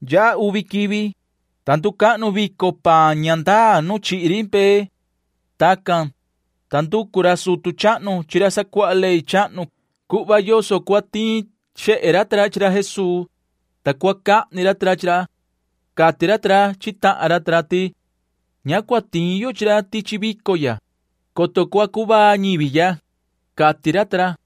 Yaha uvi quivi, ta nducahnu vico paan ña ndaa nu ni chihi ri mbee. Tacan, ta nducu ra sutu chahnu chi ra sacuaha ley chahnu cuhva yoso cuhva cua tiin xehe ra ta ra chi ra Jesuu, ta cua cahni ra ta ra chi ra. Cati ra ta ra chi tahan ra ti: ―Ña cua tiin yo chi ra tichi vico ya, coto cua cuvaa ñivi ya ―cati ra ta ra.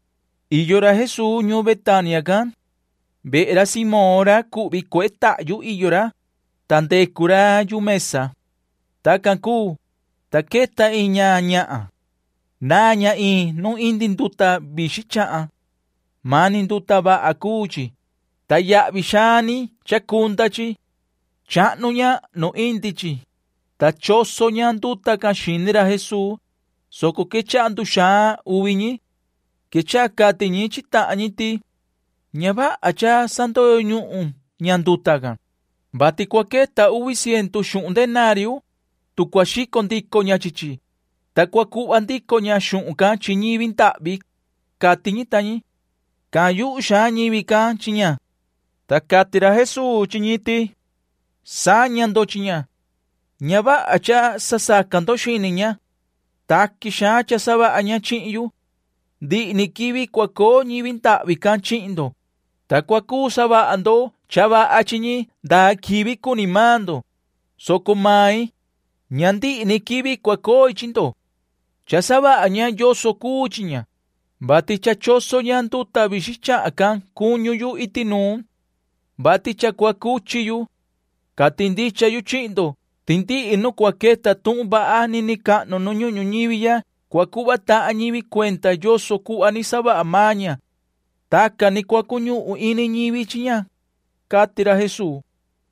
Iyo ra Jesuu ñuun Betania can. Vehe ra Simón ra cuhvi cuehe tahyu iyo ra, ta ndecu ra yu mesa. Tacan cuu, ta queta iin ña ñahan. Naan ña iin nu indi nduta vixin chahan. Mani nduta vaha cuu chi, ta yahvi xaan ni chacunda chi. Chahnu ña nu indi chi, ta choso ña nduta can xini ra Jesuu, soco quechaha nduxaan uvi ñi. Quechaha cati ñi chi tahan ñi ti: ―Ña vaha cha sandoyo ñuhun ña nduta can, vati cua queta uvi ciendu xuhun denario, tu cua xico ndico ña chi chi, ta cua cuhva ndico ña xuhun can chi ñivi ndahvi ―cati ñi ta ñi. Cahan yuhu xaan ñivi can chi ña. Ta cati ra Jesuu chi ñi ti: ―Saña ndo chi ña. Ña vaha cha sasaca ndo xini ña. Taqui xaan cha savaha ña chihin yu. Ndihi ni quivi cua coo ñivi ndahvi can chihin ndo, ta cua cuu savaha ndo cha vaha chi ñi ndaa quivi cua cuni maan ndo, soco main―ña ndihi ni quivi cua coi chi ndo. Cha savaha ña yoso cuu chi ña, vati cha choso ña nduta vixin chahan can cuñu yu iti nuun, vati cha cua cuchi yu. Cati ndicha yu chihin ndo ti ndihi nu cua queta tuhun vaha nini cahnu nu ñuhun ñuñivi ya cua cuhva tahan ñivi cuenda yoso cuhva ni savaha maan ña. Tacan ni cua cuñuhun ini ñivi chi ña ―cati ra Jesuu.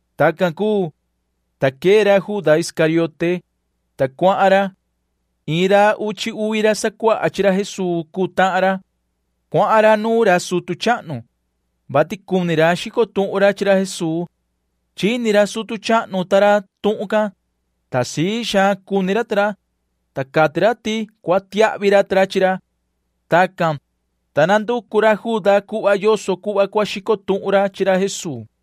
Tacan cuu, ta quee ra Juda Iscariote, ta cuahan ra. Iin ra uchi uvi ra sacuaha chi ra Jesuu cuu tahan ra. Cuahan ra nuun ra sutu chahnu, vati cuni ra xico tuhun ra chi ra Jesuu. Chini ra sutu chahnu ta ra tuhun can, ta sii xaan cuni ra ta ra, ta cati ra ti cua tiahvi ra chi ra. Tacan, ta nanducu ra Juda cuhva yoso cuhva cua cuu xico tuhun ra chi ra Jesuu.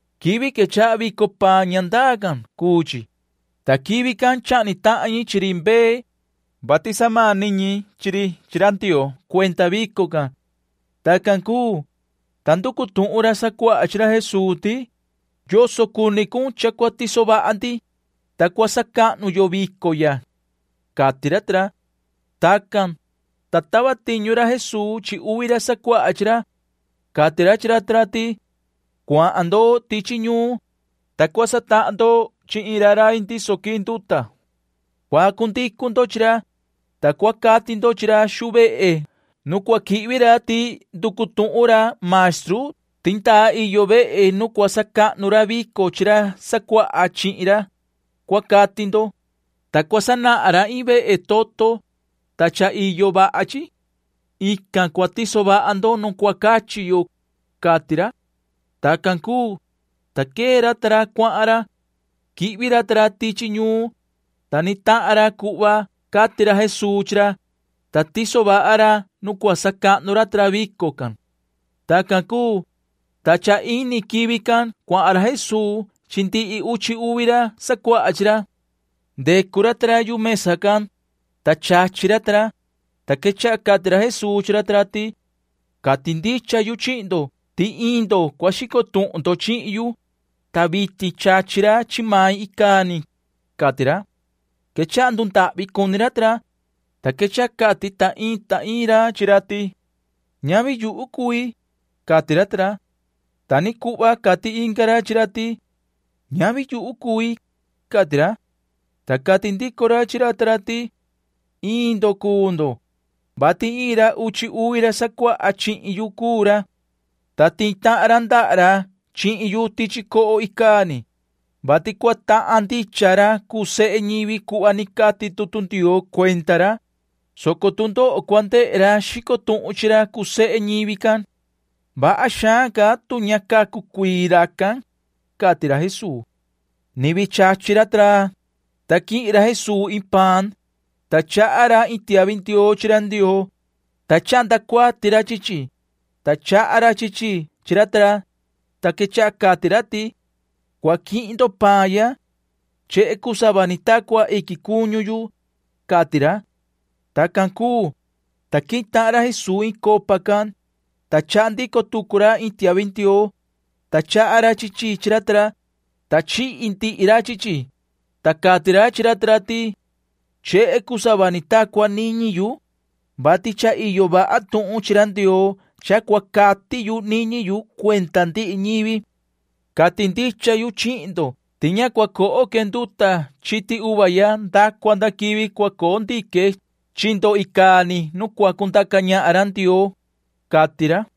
Quivi quechaha vico paan ña ndaa can cuu chi, ta quivi can chahni tahan ñi chi ri mbee, vati samani ñi chi ri chi ra Ndioo cuenda vico can. Tacan cuu, ta nducu tuhun ra sacuaha chi ra Jesuu ti: ―¿Yoso cuni cun cha cua tiso vaha ndi, ta cua sacahnu yo vico ya? ―cati ra ta ra. Tacan, ta tava tiñu ra Jesuu chi uvi ra sacuaha chi ra. Cati ra chi ra ta ra ti: ―Cuahan ndo tichi ñuun, ta cua satahan ndo chi iin rai ndiso quii nduta. Cua cundicu ndo chi ra, ta cua cati ndo chi ra xuu vehe nu cua quihvi ra ti nducu tuhun ra maestru ti ndaa iyo vehe nu cua sacahnu ra vico chi ra sacuaha chihin ra, cua cati ndo, ta cua sanahan ra iin vehe toto, ta cha iyo vaha chi. Ican cua tiso vaha ndo nu cua cachi yo ―cati ra. Tacan cuu, ta quee ra ta ra cuahan ra. Quihvi ra ta ra tichi ñuun, ta ni tahan ra cuhva cati ra Jesuu chi ra, ta tiso vaha ra nu cua sacahnu ra ta ra vico can. Tacan cuu, ta cha ini quivi can cuahan ra Jesuu chi ndihi uchi uvi ra sacuaha chi ra. Ndecu ra ta ra yu mesa can, ta chachi ra ta ra, ta quechaha cati ra Jesuu chi ra ta ra ti: ―Cati ndicha yu chihin ndo ti iin ndo cua xico tuhun chihin yu, ta vitin chachi ra chi main icaa ni ―cati ra. Quechaha ndundahvi cuni ra ta ra, ta quechaha cati ta iin ta iin ra chi ra ti: ―Ñavi yuhu cui ―cati ra ta ra. Ta ni cuhva cati inga ra chi ra ti: ―Ñavi yuhu cui ―cati ra. Ta cati ndico ra chi ra ta ra ti: ―Iin ndo cuu ndo, vati iin ra uchi uvi ra sacuaha chihin yu cuu ra, ta tihi tahan ra ndaha ra chihin yu tichi coho icaa ni, vati cua tahan ndicha ra cuu sehe ñivi cuhva ni cati tutu Ndioo cuenda ra, soco tu ndoho cua ndehe ra xico tuhun chi ra cuu sehe ñivi can. Vaha xaan ca tu ña cacu cuii ni racan ―cati ra Jesuu. Ni vii chachi ra ta ra, ta quihin ra Jesuu iin paan, ta chaha ra iin tiahvi ndioo chi ra Ndioo, ta chahnda cuati ra chi chi, ta chaha ra chi chi chi ra ta ra, ta quechaha cati ra ti: ―Cua quihin ndo paan ya. Chehe cuu sava ni ta cua iquin cuñu yu ―cati ra. Tacan cuu, ta quihin tahan ra Jesuu iin copa can, ta chaha ndico tucu ra iin tiahvi ndioo, ta chaha ra chi chi chi ra ta ra, ta chihi ndihi ra chi chi, ta cati ra chi ra ta ra ti: ―Chehe cuu sava ni ta cua niñi yu, vati cha iyo vaha tuhun chi ra Ndioo cha cua cati yu niñi yu cuenda ndihi ñivi. Cati ndicha yu chihin ndo ti ña cua coho que nduta chiti uva ya nda cua nda quivi cua coo ndique chi ndo icaa ni nu cua cundaca ñahan ra Ndioo ―cati ra.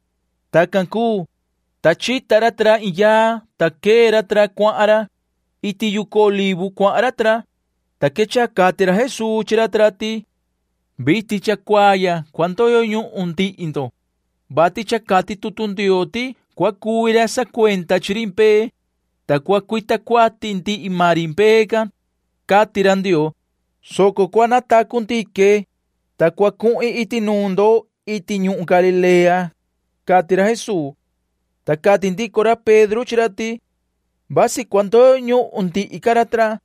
Tacan cuu, ta chita ra ta ra iin yaa, ta quee ra ta ra cuahan ra. Iti yucu Olivo cuahan ra ta ra, ta quechaha cati ra Jesuu chi ra ta ra ti: ―Vitin cha cuaa ya cua ndoyo ñuhun ndihi ndo, vati cha cati tutu Ndioo ti cua cuvi ra sacuenda chi ri mbee, ta cua cuita cuati ndihi maan ri mbee can, cati ra Ndioo, soco cua natacu ndique, ta cua cuhin iti nuun ndo iti ñuhun Galilea ―cati ra Jesuu. Ta cati ndico ra Pedro chi ra ti: ―Vasi cua ndoyo ñuhun ndihi ca ra ta ra,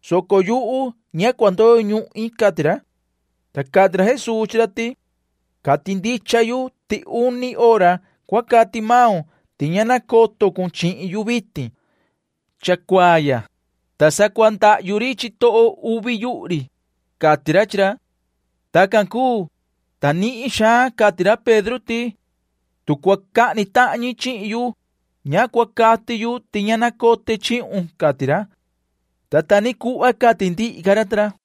soco yuhu ña cua ndoyo ñuhin ―cati ra. Ta cati ra Jesuu chi ra ti: ―Cati ndicha yu ti uni hora cua cati maun ti ña nacoto cun chihin yu vitin cha cuaa ya, ta sa cua ndahyu ri chitoho uvi yuhu ri ―cati ra chi ra. Tacan cuu, ta nihin xaan ca cati ra Pedro ti: ―Tu cua cahni tahan ñi chihin yu, ña cua cati yu ti ña nacote chihun ―cati ra. Ta ta ni cuhva cati ndihi ca ra ta ra.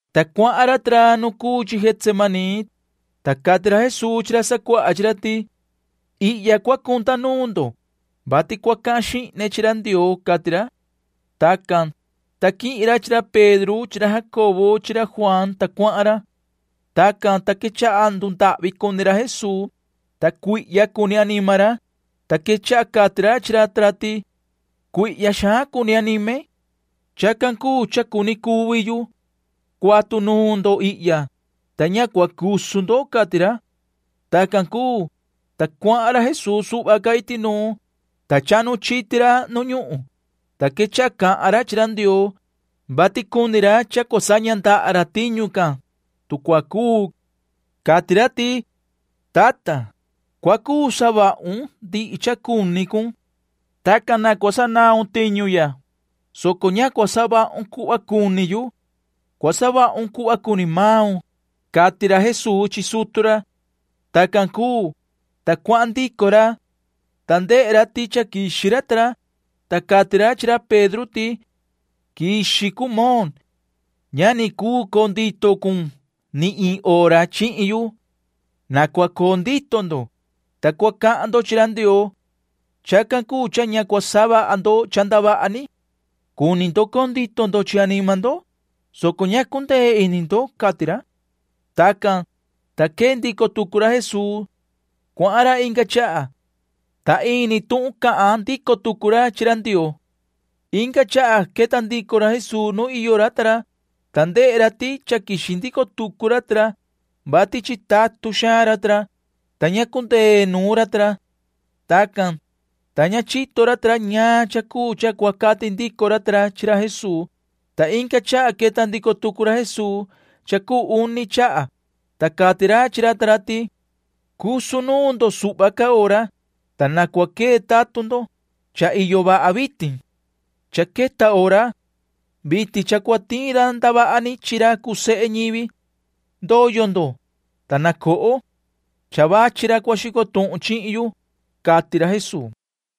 Ta cuahan ra ta ra nu cuu chi Getsemaní, ta cati ra Jesuu chi ra sacuaha chi ra ti: ―Ihya cua cunda nuun ndo, vati cua cahan xihne chi ra Ndioo ―cati ra. Tacan, ta quihin ra chi ra Pedro chi ra Jacobo chi ra Juaan, ta cuahan ra. Tacan, ta quechaha ndundahvi cuni ra Jesuu, ta cuihya cuni anima ra, ta quechaha cati ra chi ra ta ra ti: ―Cuihya xaan cuni anime. Chacan cuu cha cuni cuvi yu. Cuatu nuun ndo ihya, ta ña cua cusu ndo ―cati ra. Tacan cuu, ta cuahan ra Jesuu suhva ca iti nuun, ta chahnu chiti ra nu ñuhun, ta quechaha cahan ra chi ra Ndioo, vati cuni ra cha cua saña ndaha ra tiñu can, tu cua cuu. Cati ra ti: ―Tata, cua cuu savahun ndihi cha cuni cun. Tacan na cua sanaun tiñu ya, soco ña cua savahun cuhva cuni yu. Cua savahun cuhva cuni maun ―cati ra Jesuu chi sutu ra. Tacan cuu, ta cuahan ndico ra, ta ndehe ra ti cha quixi ra ta ra, ta cati ra chi ra Pedro ti: ―Quixi cun, Moon. Ña ni cuu coo ndito cun ni iin hora ni chihin yu. Na cua coo ndito ndo, ta cua cahan ndo chi ra Ndioo. Chacan cuu cha ña cua savaha ndo cha ndavaha ni. Cuni ndo coo ndito ndo chi anima ndo, soco ña cundee ini ndo ―cati ra. Tacan, ta quee ndico tucu ra Jesuu. Cuahan ra inga chaha, ta ini tuhun can cahan ndico tucu ra chi ra Ndioo. Inga chaha queta ndico ra Jesuu nu iyo ra ta ra, ta ndehe ra ti cha quixi ndico tucu ra ta ra, vati chitatun xaan ra ta ra, ta ña cundee nuun ra ta ra. Tacan, ta ña chito ra ta ra ñaan cha cuu cha cua cati ndico ra ta ra chi ra Jesuu, ta inga chaha queta ndico tucu ra Jesuu cha cuu uni chaha, ta cati ra chi ra ta ra ti: ―Cusu nuun ndo suhva ca hora, ta na cua quee tatun ndo. Cha iyo vaha vitin. Cha queta hora. Vitin cha cua tiin ra ndavaha ni chi ra cuu sehe ñivi. Ndoyo ndo, ta na coho. Cha vachi ra cua xico tuhun chihin yu ―cati ra Jesuu.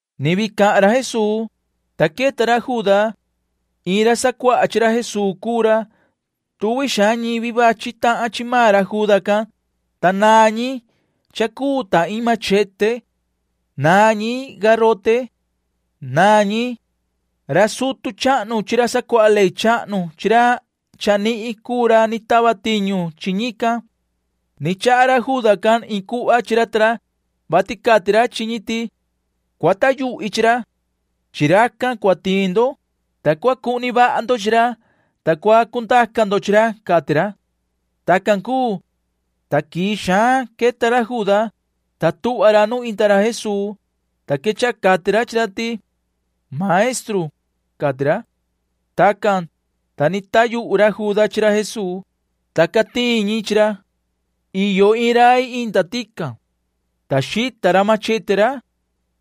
Ni vii cahan ra Jesuu, ta queta ra Juda. Iin ra sacuaha chi ra Jesuu cuu ra. Tuvi xaan ñivi vachi tahan chi maan ra Juda can, ta naan ñi cha cuu ta iin machete. Naan ñi garote. Naan ñi. Ra sutu chahnu chi ra sacuaha ley chahnu chi ra chanihin cuu ra ni tava tiñu chi ñican. Ni chaha ra Juda can iin cuhva chi ra ta ra, vati cati ra chi ñi ti: ―Cua taa yuhi chi ra. Chi racan cua tiin ndo, ta cua cuhni vaha ndo chi ra, ta cua cundaca ndo chi ra ―cati ra. Tacan cuu, ta quii xaan queta ra Juda, ta tuhva ra nu inda ra Jesuu, ta quechaha cati ra chi ra ti: ―Maestru ―cati ra. Tacan, ta ni taa yuhu ra Juda chi ra Jesuu, ta ca tiin ñi chi ra. Iyo iin rai inda tican, ta xita ra machete ra,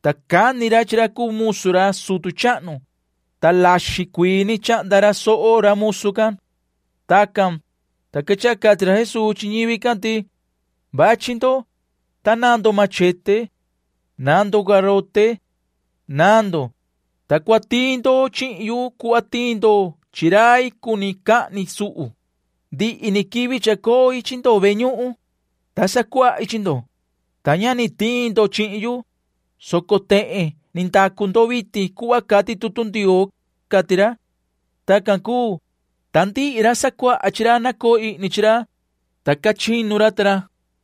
ta cani ra chi ra cuu musu ra sutu chahnu, ta laxin cuii ni chahnda ra soho ra musu can. Tacan, ta quechaha cati ra Jesuu chi ñivi can ti: ―Vachi ndo, ta naan ndo machete. Naan ndo garote. Naan ndo, ta cua tiin ndo chihin yu cuhva tiin ndo chi rai cuni cahni suhu. Ndihi ni quivi chacoi chi ndo ve ñuhun, ta sacuahi chi ndo, ta ña ni tiin ndo chihin yu, soco tehen ni ndacu ndo vitin cuhva cati tutu Ndioo ―cati ra. Tacan cuu, ta ndihi ra sacuaha chi ra nacoo ihni chi ra, ta ca chinu ra ta ra.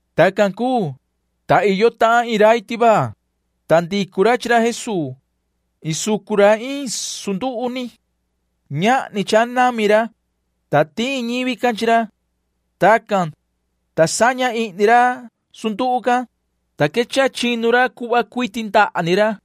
Tacan cuu, ta iyo tahan iin rai tivaa, ta ndicu ra chi ra Jesuu. Isucu ra iin sunduhu ni. Ñahni cha nami ra, ta tiin ñivi can chi ra. Tacan, ta saña ihni ra sunduhu can, ta quechaha chinu ra cuhva cuiti ndaha ni ra.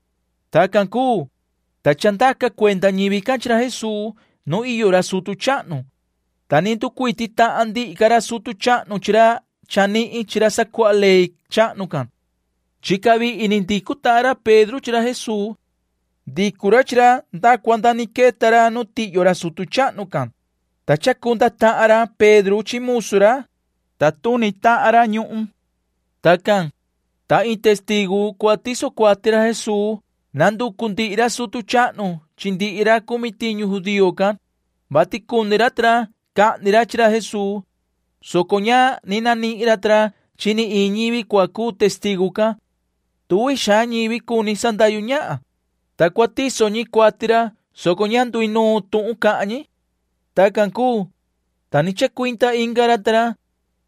Tacan cuu, ta chandaca cuenda ñivi can chi ra Jesuu nu iyo ra sutu chahnu, ta ni nducuiti tahan ndihi ca ra sutu chahnu chi ra chanihin chi ra sacuaha ley chahnu can. Chica vihi ni ndicu tahan ra Pedro chi ra Jesuu. Ndicu ra chi ra nda cua nda ni queta ra nu tihyo ra sutu chahnu can, ta chacunda tahan ra Pedro chi musu ra, ta tuni tahan ra ñuhun. Tacan, ta iin testigu cua tiso cuati ra Jesuu nanducu ndihi ra sutu chahnu chi ndihi ra cumi tiñu judío can, vati cuni ra ta ra cahni ra chi ra Jesuu, soco ña ni nanihin ra ta ra chi iin ñivi cua cuu testigu can. Tuvi xaan ñivi cuni sandahyu ñahan, ta cua tiso ñi cuati ra, soco ña nduinuun tuhun cahan ñi. Tacan cuu, ta ni chacuinda inga ra ta ra,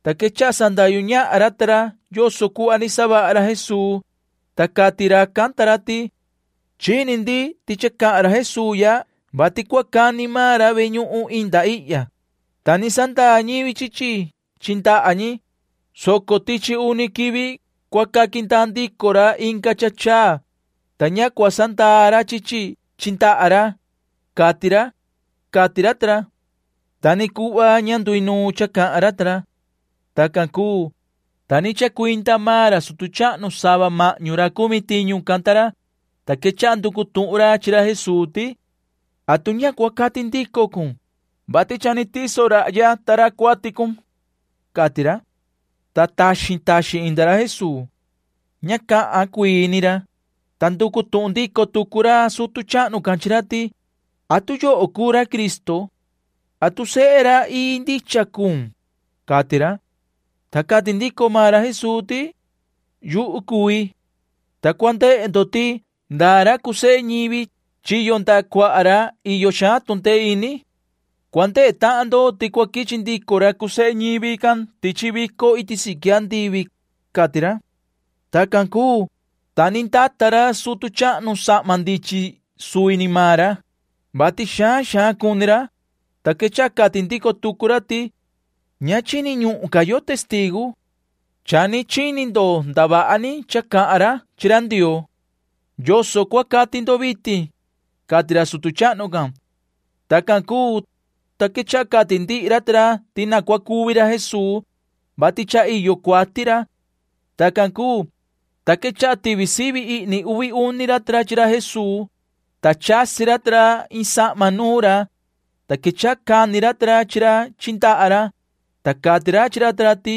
ta quechaha sandahyu ñahan ra ta ra yoso cuhva ni savaha ra Jesuu, ta cati racan ta ra ti: ―Chini ndi ti cha cahan ra Jesuu ya vati cua cani maan ra ve ñuhun inda ihya, ta ni sandaa ñivi chi chi chi ndaha ñi, soco tichi uni quivi cua caqui ndaa ndico ra inga cha chaa, ta ña cua sandaa ra chi chi chi ndaha ra, cati ra ―cati ra ta ra. Ta ni cuhva ña nduinuun cha cahan ra ta ra. Tacan cuu, ta ni chacuinda maan ra sutu chahnu sava mahñu ra cumi tiñu can ta ra, ta quechaha nducu tuhun ra chi ra Jesuu ti: ―¿Atu ña cua cati ndico cun, vati cha ni tiso rahya ta ra cuati cun? ―cati ra. Ta taxin taxin inda ra Jesuu. Ña cahan cuii ni ra, ta nducu tuhun ndico tucu ra sutu chahnu can chi ra ti: ―¿Atu yoho cuu ra Cristo? ¿Atu sehe ra ii ndicha cuun? ―cati ra. Ta cati ndico maan ra Jesuu ti: ―Yuhu cui, ta cua ndehe ndo ti ndaa ra cuu sehe ñivi chiyo ndaha cuaha ra iyo xaan tu ndee ini. Cua ndehe tahan ndo ti cua quichi ndico ra cuu sehe ñivi can tichi vico iti siqui andivi ―cati ra. Tacan cuu, ta ni ndata ra sutu chahnu sahma ndichin suvi ni maan ra, [vati xaan xaan cuni ra,] ta quechaha cati ndico tucu ra ti: ―Ña chini ñuhun ca yo testigu. Cha ni chini ndo ndavaha ni cha cahan ra chi ra Ndioo. ¿Yoso cua cati ndo vitin? ―cati ra sutu chahnu can. Tacan cuu, ta quechaha cati ndihi ra ta ra ti na cua cuvi ra Jesuu, vati cha iyo cuati ra. Tacan cuu, ta quechaha tivi sivi ihni uvi uni ra ta ra chi ra Jesuu, ta chasi ra ta ra iin sahma nuun ra, ta quechaha cani ra ta ra chi ra chi ndaha ra, ta cati ra ta ra chi ra ti: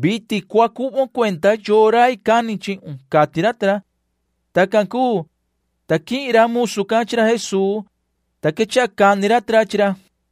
―Vitin cua cuhvon cuenda yoo rai cani chihun ―cati ra ta ra. Tacan cuu, ta quihin ra musu can chi ra Jesuu, ta quechaha cani ra ta ra chi ra.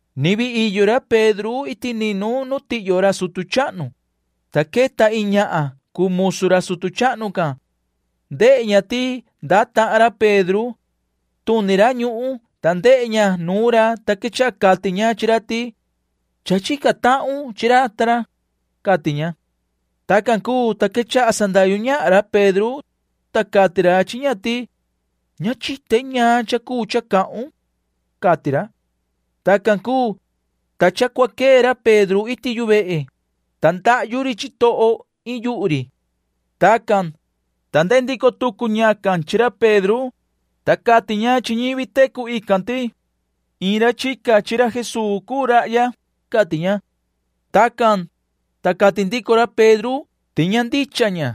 Ni vii iyo ra Pedro iti ninu nu tihyo ra sutu chahnu, ta queta iin ñahan cuu musu ra sutu chahnu can. Ndehe ña ti ndaa tahan ra Pedro. Tuni ra ñuhun, ta ndehe ña nuun ra, ta quechaha cati ña chi ra ti: ―Cha chica tahun chi ra Jesuu ―cati ña. Tacan cuu, ta quechaha sandahyu ñahan ra Pedro, ta cati ra chi ña ti: ―Ña chite ñaan cha cuu cha cahun ―cati ra. Tacan cuu, ta cha cua quee ra Pedro iti yu vehe, ta ndahyu ri chitoho iin yuhu ri. Tacan, ta ndehe ndico tucu ñacan chi ra Pedro, ta cati ña chi ñivi tecu ican ti: ―Iin ra chica chi ra Jesuu cuu rahya ―cati ña. Tacan, ta cati ndico ra Pedro ti ña ndicha ña,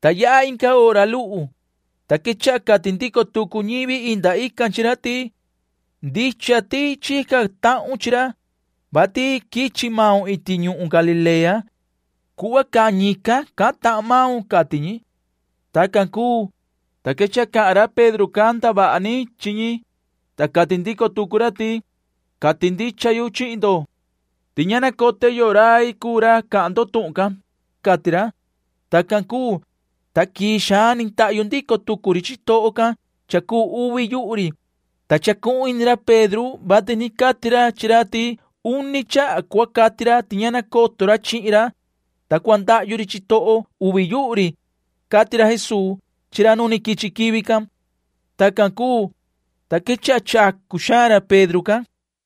ta yaha inga hora luhu, ta quechaha cati ndico tucu ñivi inda ican chi ra ti: ―Ndicha ti cha chica tahun chi ra, vati quichi maun iti ñuhun Galilea. Cuhva cahan ñican cahan tahan maun ―cati ñi. Tacan cuu, ta quechaha cahan ra Pedro can ndavaha ni chi ñi, ta cahan rai xaan ra, ta cati ndico tucu ra ti: ―Ña nacote yoo rai cuu ra cahan ndo tuhun can ―cati ra. Tacan cuu, ta quii xaan ni ndahyu ndico tucu ri chitoho can cha cuu uvi yuhu ri, ta chacuhun ini ra Pedro vati ni cati Jesuu chi ra ti uni chaha cua cati ra ti ña nacoto ra chihin ra, ta cua ndahyu ri chitoho uvi yuhu ri, cati ra Jesuu chi ra nu quichi quivi can. Tacan cuu, ta quechaha chacu xaan ra Pedro can.